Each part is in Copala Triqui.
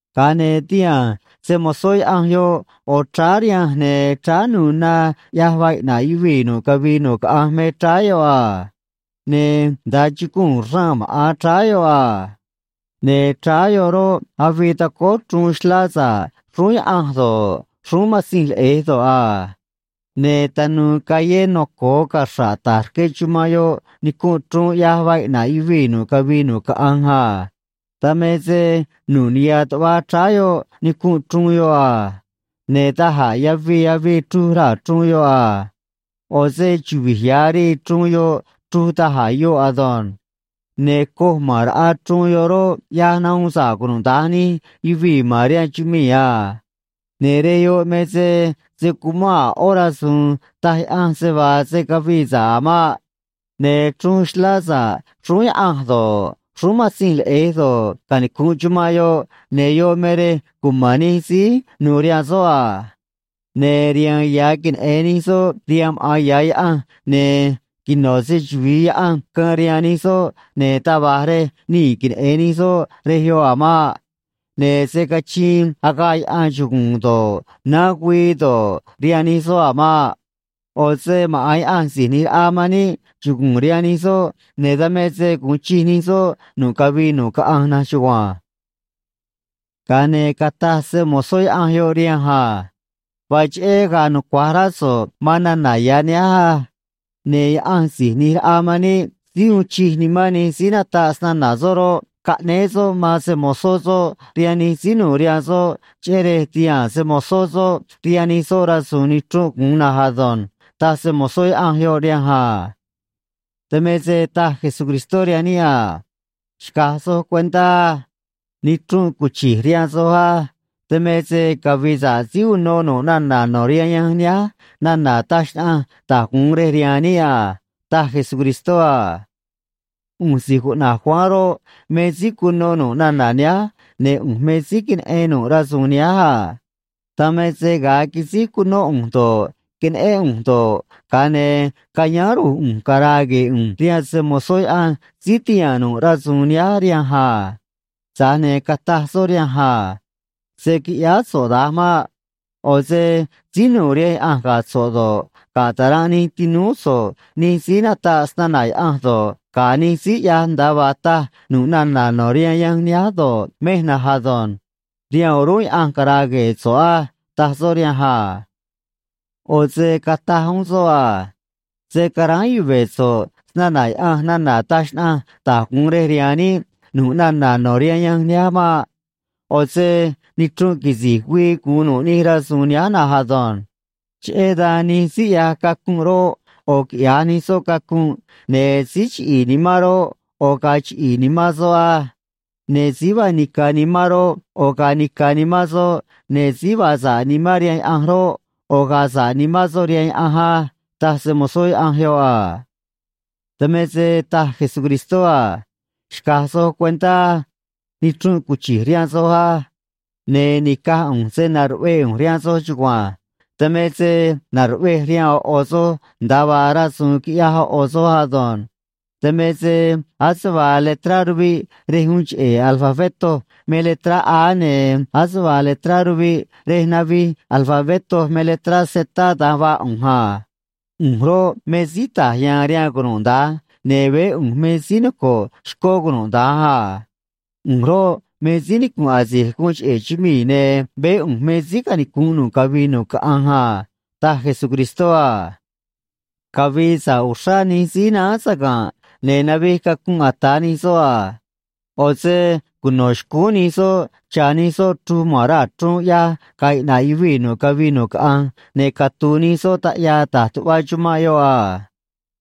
Ga̱a ne̱ tihaa̱n se‑mo̱zó Yaꞌanj yoꞌ ꞌo̱ chráá rihanj, ne̱ chráá nu̱u̱ na ꞌyaj vaa iꞌna̱ꞌ yuvii̱ nu̱ꞌ cavii nu̱ꞌ caꞌanj me chráá yoꞌ a. Ne̱ nda̱a chuguu̱n raa̱n maꞌa̱n chráá yoꞌ a. Ne̱ chráá yoꞌ roꞌ, avii tacóó chruun xlá sa̱ꞌ xrúún Yaꞌanj do̱ꞌ, xrúún Matzinj Leꞌe̱j do̱ꞌ a. Ne̱ tanu̱u̱ callé noco̱o caxra̱ꞌ ta̱j rque chumanꞌ yoꞌ nicunꞌ chruun ꞌyaj vaa iꞌna̱ꞌ yuvii̱ nu̱ꞌ cavii nu̱ꞌ caꞌanj a. Dan me se nu̱ꞌ niha̱ tuꞌva chráá yoꞌ nicunꞌ chruun yoꞌ a. Ne̱ da̱j a̱ yavii avii chruj raa̱ chruun yoꞌ a. ꞌO̱ se chuvi̱j ya̱ rii chruun yoꞌ chruj da̱j a̱ yoꞌ ado̱nj. Ne̱ coj ma̱n raꞌa chruun yoꞌ roꞌ, ꞌyaj nahuun sa̱ꞌ cunuda̱nj nij yuvii̱ ma̱n rihaan chumii̱ a. Ne̱ rej yoꞌ me se se̱ cuman a̱ ꞌó rasu̱u̱n taj Yaꞌanj se vaa se̱ cavii sa̱ꞌ a̱ maꞌ. Ne̱ chruun xlá sa̱ꞌ xrúún Yaꞌanj do̱ꞌ, xrúún Matzinj Leꞌe̱j do̱ꞌ, canicu̱nꞌ chumanꞌ yoꞌ, ne̱ yoꞌ me rej cuma̱n nij síí nu̱u̱ rihaan soꞌ a. Ne̱ riha̱a̱n ya̱ queneꞌe̱n nij soꞌ rihaan maꞌa̱n ya̱ Yaꞌanj, ne̱ quino̱ se‑chuvi̱i Yaꞌanj caan rihaan nij soꞌ, ne̱ taj va̱j rej nii̱ queneꞌe̱n nij soꞌ rej yoꞌ a̱ maꞌ. Ne̱ se̱ cachiin agaꞌ yaꞌan chuguu̱n do̱ꞌ, naán güii do̱ꞌ, rihaan nij soꞌ a̱ maꞌ. ꞌO̱ se maꞌa̱n Yaꞌanj Si̱j ꞌNi̱j Raꞌa man níꞌ chugu̱u̱n rihaan nij soꞌ, ne̱ dan me se gu̱un chij nij soꞌ nu̱ꞌ cavii nu̱ꞌ caꞌanj na̱nj chugua̱nj. Ga̱a ne̱ cataj se‑mo̱zó Yaꞌanj yoꞌ rihanj a: ―Vaa cheꞌé ga̱a̱ nucua̱j rá so̱ꞌ man nana̱ ya̱ nihánj á. Ne̱ Yaꞌanj Si̱j ꞌNi̱j Raꞌa man níꞌ síí uun chij nimán nij síí nataꞌ snana̱ soꞌ roꞌ, caꞌnéé soꞌ man se‑mo̱zó soꞌ rihaan nij síí nu̱u̱ rihaan soꞌ, cheꞌé rej ti̱haa̱n se‑mo̱zó soꞌ rihaan nij soꞌ rasu̱u̱n nichrunꞌ gu̱un na̱nj ado̱nj ―taj se‑mo̱zó Yaꞌanj yoꞌ rihanj a. Dan me se taj Jesucristó rihaan níꞌ a: ―Xca̱j soj cuentá á. Nichrunꞌ cuchi̱j rihaan soj á. Dan me se cavi̱i̱ sa̱ꞌ síí uno nu̱ꞌ nana̱ no̱ rihaan yanj nihánj nana̱ taj xnaꞌanj da̱j gu̱un rej rihaan níꞌ a ―taj Jesucristó a. ꞌU̱nj si̱j cuꞌna̱j Juan roꞌ, me síí cuno nu̱ꞌ nana̱ nihánj, ne̱ ꞌu̱nj me síí queneꞌen nu̱ꞌ rasu̱u̱n nihánj a. Dan me se ga̱a quisíj cunó ꞌu̱nj do̱ꞌ, queneꞌén ꞌu̱nj do̱ꞌ, ga̱a ne̱ cayáán ru̱j ꞌu̱nj cara̱a̱ gue̱e̱ ꞌu̱nj rihaan se‑mo̱zó Yaꞌanj síí tihaa̱n nu̱ꞌ rasu̱u̱n nihánj rihanj a. Tza̱j ne̱ cataj soꞌ rihanj a: ―Se̱ quiꞌyáá so̱ꞌ da̱nj maꞌ. ꞌO̱ se síí nu̱u̱ rihaan Yaꞌanj ga̱ so̱ꞌ do̱ꞌ, ga̱ ta̱ranꞌ nij tinúú so̱ꞌ nij síí nataꞌ snana̱ Yaꞌanj do̱ꞌ, ga̱ nij síí ꞌyaj nda̱a vaa taj nu̱ꞌ nana̱ no̱ rihaan yanj nihánj do̱ꞌ, mej na̱nj ado̱nj. Rihaan o̱rúnꞌ Yaꞌanj cara̱a̱ gue̱e̱ so̱ꞌ á ―taj soꞌ rihanj a. ꞌO̱ se cataj uún soꞌ a: ―Se̱ caráán yuve̱ so̱ꞌ snana̱ Yaꞌanj nana̱ taj xnaꞌanj da̱j gu̱un rej rihaan níꞌ nu̱ꞌ nana̱ no̱ rihaan yanj nihánj maꞌ. ꞌO̱ se nichrunꞌ quisi̱j güii gu̱un nu̱ꞌ nij rasu̱u̱n nihánj na̱nj ado̱nj. Cheꞌé dan nij síí ꞌyaj cacunꞌ roꞌ, ꞌo̱ quiꞌya̱j nij soꞌ cacunꞌ, ne̱ síí chiꞌi̱i̱ nimán roꞌ, ꞌo̱ ga̱a̱ chiꞌi̱i̱ nimán soꞌ á. Ne̱ síí vaa nica̱ nimán roꞌ, ꞌo̱ ga̱a̱ nica̱ nimán soꞌ, ne̱ síí vaa sa̱ꞌ nimán rihaan Yaꞌanj roꞌ, ꞌo̱ ga̱a̱ sa̱ꞌ nimán soꞌ rihaan Yaꞌanj á ―taj se‑mo̱zó Yaꞌanj yoꞌ a. Dan me se taj Jesucristó a: ―Xca̱j soj cuentá á. Nichrunꞌ cuchi̱j rihaan soj á. Ne̱ ni̱caj ꞌu̱nj se na̱ruꞌvee ꞌu̱nj rihaan soj chugua̱nj. Dan me se na̱ruꞌvej rihaan ꞌo̱ ꞌo̱ soj nda̱a vaa rasu̱u̱n quiꞌyaj ꞌo̱ ꞌo̱ soj ado̱nj. Dan me se̱ ase vaa letrá ruviꞌ rej uun cheꞌe̱ alfabetó me letrá A, ne̱ ase vaa letrá ruviꞌ rej navij alfabetó me letrá Z, da̱nj vaa ꞌu̱nj a. ꞌU̱nj roꞌ, me síí ta̱j ya̱a̱n rihaan cunuda̱nj, ne̱ veé ꞌu̱nj me síí noco̱ꞌ xcó cunuda̱nj a. ꞌU̱nj roꞌ, me síí nicu̱nꞌ asi̱j guun cheꞌe̱ chumii̱, ne̱ veé ꞌu̱nj me síí canicu̱nꞌ nu̱ꞌ cavii nu̱ꞌ caꞌanj a ―taj Jesucristó a. Cavi̱i̱ sa̱ꞌ uxrá nij síí náán saga̱nꞌ ne̱ navij cacunꞌ ata̱ nij soꞌ a. ꞌO̱ se cuno̱ xcúún nij soꞌ cha̱ nij soꞌ chruj ma̱n raa̱ chruun ꞌyaj ga̱a̱ iꞌna̱ꞌ yuvii̱ nu̱ꞌ cavii nu̱ꞌ caꞌanj, ne̱ catu̱u̱ nij soꞌ taꞌyaa ta̱j tuꞌva chumanꞌ yoꞌ a.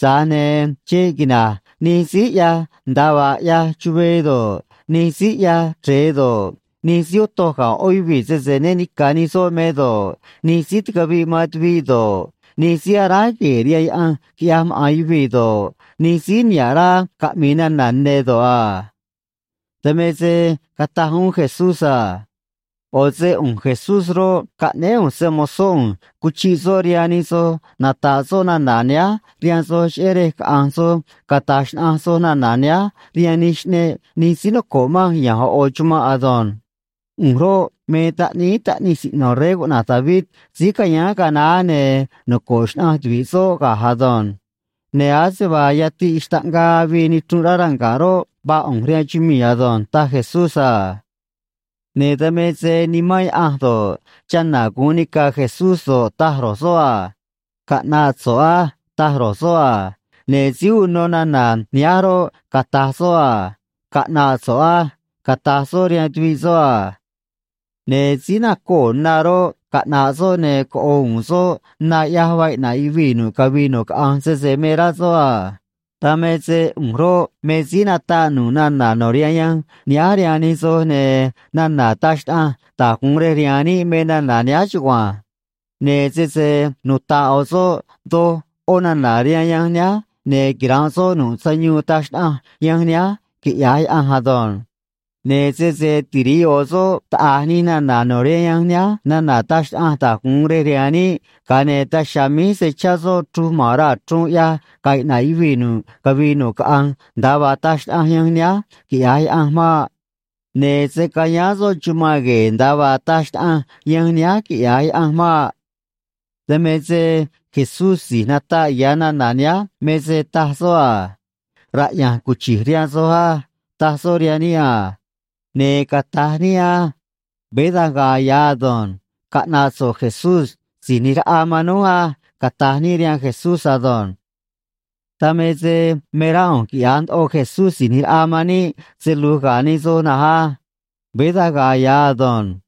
Tza̱j ne̱ xeꞌ quina̱j nij síí ꞌyaj nda̱a vaa ꞌyaj chuvee do̱ꞌ, nij síí ꞌyaj chre̱e do̱ꞌ, nij síí otoj ga̱ ꞌó yuvii̱ sese né ni̱ca̱ nij soꞌ me do̱ꞌ, nij síí ticaviꞌ man tuviꞌ do̱ꞌ, nij síí aráj gue̱e̱ rihaan yaꞌanj quiꞌyaj maꞌa̱n yuvii̱ do̱ꞌ, nij síí niha̱ꞌ rá caꞌmi̱i̱ nana̱ ne̱ do̱ꞌ a. Dan me se cataj uún Jesús a: ―ꞌO̱ se ꞌu̱nj Jesús roꞌ, caꞌnéé ꞌu̱nj se‑mo̱zó ꞌu̱nj cuchiꞌ soꞌ rihaan nij soj nata̱ꞌ soꞌ nana̱ nihánj rihaan soj, cheꞌé rej caꞌa̱nj soj cata̱j xnaꞌanj soj nana̱ nihánj rihaan nij xꞌneꞌ nij síí noco̱ꞌ manj ya̱nj ꞌo̱ ꞌo̱ chumanꞌ ado̱nj. ꞌU̱nj roꞌ, me taꞌníí taꞌnij siꞌno̱ rey cuꞌna̱j David síí cayáán ga̱a naá, ne̱ noco̱ꞌ xnaꞌanj tuvi̱ꞌ soꞌ ga̱j ado̱nj. Ne̱ ase vaa yatiꞌ xtaꞌngaa avii nichrunꞌ rá ranga̱ꞌ roꞌ, vaa ꞌu̱nj rihaan chumii̱ ado̱nj ―taj Jesús a. Ne̱ dan me se Nimán Yaꞌanj do̱ꞌ, chana̱ gu̱un nica̱ Jesús do̱ꞌ, taj ro̱j soꞌ a: “Caꞌna̱ꞌ so̱ꞌ á”, taj ro̱j soꞌ a. Ne̱ síí uno nana̱ nihánj roꞌ, cata̱j soꞌ a: “Caꞌna̱ꞌ so̱ꞌ á”, cata̱j soꞌ rihaan tuviꞌ soꞌ a. Ne̱ síí nacoo̱ na roꞌ, caꞌna̱ꞌ soꞌ, ne̱ coꞌo̱ u̱u̱n soꞌ na ꞌyaj vaa iꞌna̱ꞌ yuvii̱ nu̱ꞌ cavii nu̱ꞌ caꞌanj, sese me rá soꞌ a. Dan me se ꞌu̱nj roꞌ, me síí nataꞌ nu̱ꞌ nana̱ no̱ rihaan yanj nihánj rihaan nij soj, ne̱ nana̱ taj xnaꞌanj da̱j gu̱un rej rihaan níꞌ me nana̱ nihánj chugua̱nj. Ne̱ sese nuta̱ꞌ ꞌo̱ soꞌ doj ꞌó nana̱ rihaan yanj nihánj, ne̱ quira̱nꞌ soꞌ nu̱ꞌ sayuun taj xnaꞌanj yanj nihánj, quiꞌya̱j Yaꞌanj ado̱nj. Ne̱ sese tiri̱ꞌ ꞌo̱ soꞌ taꞌa̱j nij nana̱ no̱ rihaan yanj nihánj nana̱ taj xnaꞌanj da̱j gu̱un rej rihaan níꞌ, ga̱a ne̱ daj chiha̱a̱ míj se̱ chá soꞌ chruj ma̱n raa̱ chruun ꞌyaj ga̱a̱ iꞌna̱ꞌ yuvii̱ nu̱ꞌ cavii nu̱ꞌ caꞌanj nda̱a vaa taj xnaꞌanj yanj nihánj, quiꞌya̱j Yaꞌanj maꞌ. Ne̱ se̱ cayáán soꞌ chumanꞌ gue̱e̱, nda̱a vaa taj xnaꞌanj yanj nihánj, quiꞌya̱j Yaꞌanj maꞌ. Dan me se Jesús si̱j nataꞌ ya̱ nana̱ nihánj me se taj soꞌ a: “Raꞌya̱nj cuchi̱j rihaan soj á”, taj soꞌ rihaan níꞌ a. Ne̱ cata̱j níꞌ á: “Veé da̱nj ga̱a̱ ya̱ ado̱nj. Caꞌna̱ꞌ so̱ꞌ Jesús Si̱j ꞌNi̱j Raꞌa man núj á”, cata̱j níꞌ rihaan Jesús ado̱nj. Dan me se me rá ꞌu̱nj quiꞌya̱j ndoꞌo Jesús Si̱j ꞌNi̱j Raꞌa man níꞌ se lu̱j ga̱ nij soj na̱nj á. Veé da̱nj ga̱a̱ ya̱ ado̱nj.